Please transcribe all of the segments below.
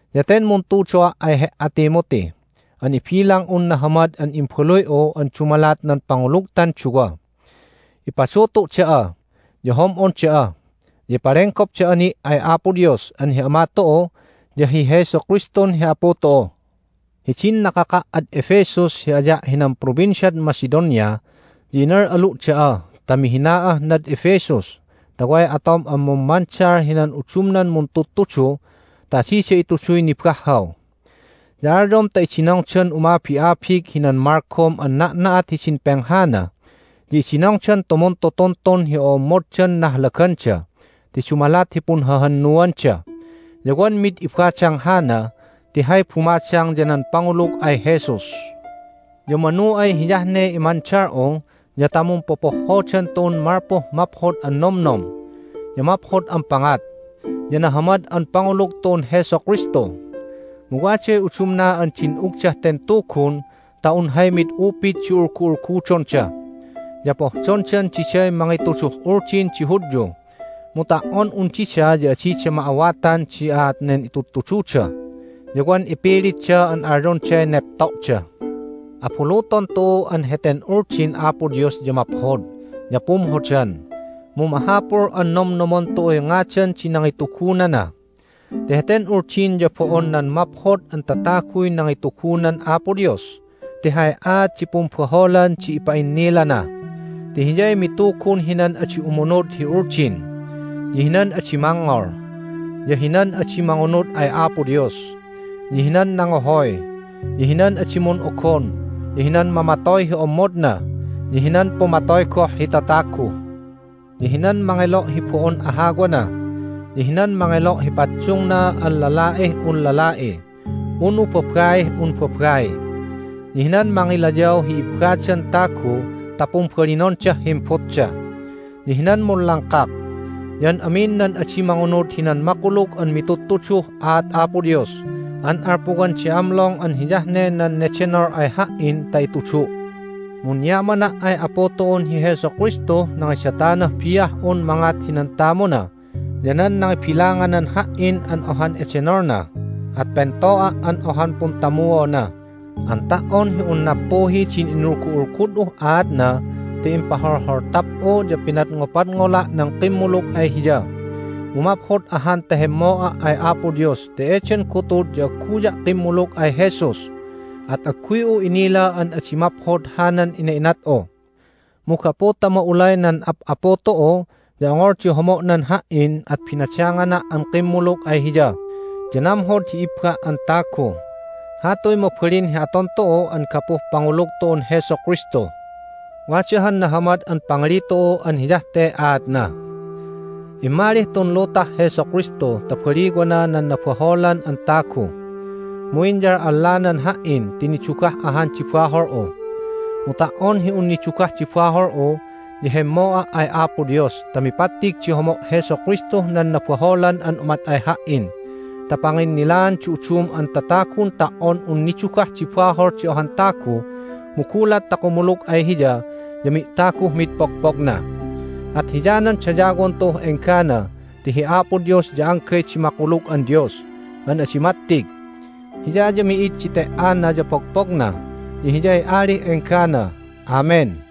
Ya ten muntudo'a' ay he"a, Timothy, an ibilang'un nahamad an imbaluy'u an dumalat nan pangulugtan duwa. Ipadutu' da'a, ya hom'on da'a, ya impalenggop da'a ni' ay Apo Dios an hi Ama tu'u ya hi Jesu Kristun hi Apu tu'u. Hidin nakaka' ad Ephesus hi aya' hinan Provinciad Macedonia ya inal'alu' da'a ta mihina'ah nad Ephesus ta way atom an mummandal hinan udumnan muntudtudu ta adida ituduy nibahhaw. Ya alyom ta idinongdan umabi'abig hinan malgom an na'na'at hidin penghana, ya idinongdan tumuntutuntun hi o'ommoddan nahlaganda ti dumalat hi punhahannuanda. Ya wan mid ibadang hana ti hay bumadang ya nan pangulug ay Jesus. Ya manu ay hiyah ne imandal'u ya ta mumpopohhodan tu'un malpuh maphod an nomnom, ya maphod an pangat, ya nahamad an pangulug tu'un Jesu Kristu. Mu waday udumna an din'ugdah ten Tugun ta un hay mid upid di ulgu'ulgudonda. Ya pohdondan diday mangituduh Uldin di Hudyu, mu ta"on un dida ya adida ma'awatan di aat nen itudtududa ya wan ipilitda an alyonday nepto'da. Abuluton tu'u an heten Uldin Apo Dios ya maphod ya pumhodan, mu mahapul an nomnomon tu'uy ngadan di nangitugunana ti heten Uldin ya bo'on nan maphod an tataguy nangitugunan Apo Dios ti hay aat di pumbaholan di ipa'innilana. Ti hiyay mitugun hinan adi umunud hi Uldin, ya hinan adi mangngol, ya hinan adi mangunud ay Apo Dios, ya hinan nangohoy, ya hinan adi mun'ogon, ya hinan mamatoy hi ommodna, ya hinan pumatoy goh hi tatagu, ya hinan mangelo' hi bo'on ahawana, ya hinan mangelo' hi paddungna an lala'ih un lala'i, unu babaih un babai, ya hinan mangilayaw hi ibbadan tagu ta pumbalinondah himbutda, ya hinan munlangkak, ya an amin nan adi mangunud hinan makulug an mitudtuduh aat Apo Dios an alpuwan di amlong an hiyah ne nan nedenol ay ha"in ta itudu'. Munyamana' ay Apu tu'un hi Jesu Kristuh nangidatanah bi'ah'un mangat hinan tamuna ya nan nangibilanganan ha"in an ohan edenolna, at pento'a' an ohan puntamuona an ta"on hi un nappuhi din inulgu'ulgud'uh aatna ti impaholholtap'u ya pinadngopadngola' nan kimmulug ay Hiya. Mu maphod ahan ta hemmo'a' ay Apo Dios ti eden gutud ya agguya' kimmulug ay Jesus, at agguy'u inila an adi maphod hanan ina'inat'u. Mu gapu ta ma'ulay nan Ap'apu tu'u ya ongol di homo'nan ha"in at binadangana' an kimmulug ay Hiya ya namhod hi ibba' an tagu. Hatuy mabalin hi aton tu'u an gapuh pangulug tu'un Jesu Kristu. Wada han nahamad an pangali tu'u an hiyah te aatna: Immalih tun lutah Jesu Kristu ta baliwana nan nabaholan an tagu. Mu inyal'allanan ha"in ti nidugah ahan di bahol'u! Mu ta"on hi un nidugah di bahol'u ya hemmo'a' ay Apo Dios ta mipattig di homo' Jesu Kristuh nan nabaholan an umat ay ha"in ta panginnilaan di udum an tatagun ta"on un nidugah di bahol di ohan tagu, mu gulat ta kumulug ay Hiya ya mi'taguh mid pogpogna. At hiyanan dayawon tu'uh enggana ti hi Apo Dios ya anggay di makulug an Dios an adi mattig. Hiya ya mi'id di te"ana ya pogpogna, ya Hiyay Alih enggana! Amen!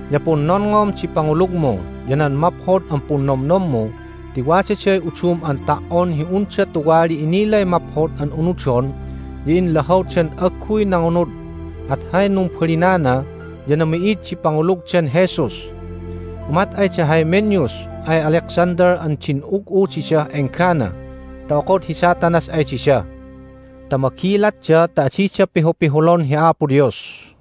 Ya punnonngom di pangulugmu ya nan maphod an punnomnommu ti wadaday udum an ta"on hi unda tuwali inilay maphod an unudon, ya inlahawdan agguy nangunud, at hay numbalinana ya nami'id di pangulugdan Jesus. Umat ay da Hymenaeus ay Alexander an din'ug'u didah enggana ta okod hi Satanas ay dida. Ta magilatda ta adida pihupihulon hi Apo Dios.